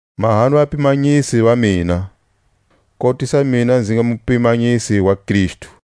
Mahani vapimanyisi va mina, kotisa mina nzi nga mupimanyisi wa Kristu.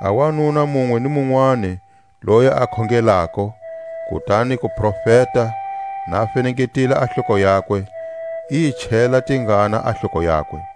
A wanuna munwe ni munwani loyi a khongelako, kutani ku profeta, na fenengetile a hloko yakwe, i yi chela tingana a hloko yakwe.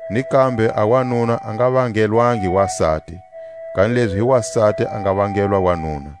Ni kambe a wanuna a nga vangelangi wasati, kanilezi hi wasati a nga vangelwa wanuna.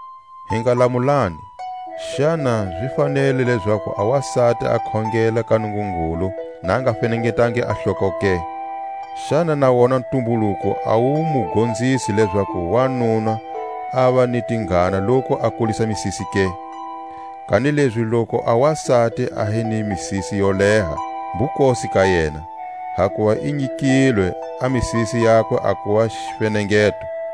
Hi nga lamulani, xana zi fanele lezaku a wasati a khongela ka Nungungulu na a nga fenengetangi a hloko ke? Xana na wona ntumbuluko a wu mu gonzisi lezaku wanuna ava ni tingana loku a kulisa misisi ke? Kanilezi loku a wasati a hi ni misisi yo leha, mbukosi ka yena; hakuva i nyikilwe a misisi yakwe a kuva xifenengeto.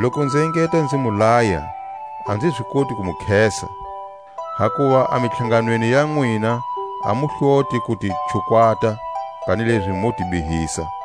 Loku nzi engeta nzi mu laya a nzi zi koti ku mu khesa, hakuva a mitlhanganweni ya nwina a mu hloti ku ti chukwata, kanilezi mo ti bihisa.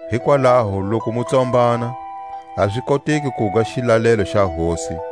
Hikwalaho loku mu tsombana, a zi koteki kuga xilalelo xa Hosi,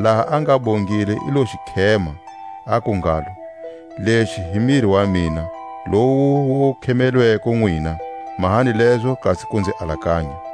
laha a nga bongile i lo xi khema, aku ngalo: Lexi hi miri wa mina, lowu wu khemelelweko nwina; mahani lezo kasi ku nzi alakanya.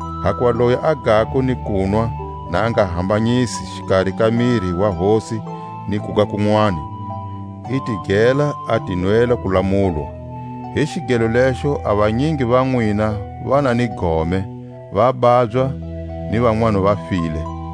Hakuva loyi a gako ni kunwa na a nga hambanyisi xikari ka miri wa Hosi ni kuga kunwani, i ti gela a ti nwela kulamulwa. Hi xigelo lexo a vanyingi va nwina va na ni gome, va babya, ni vanwani va file.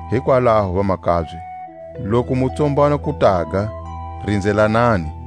Hikwalaho, vamakabye, loku mu tsombana ku taga, rinzelanani.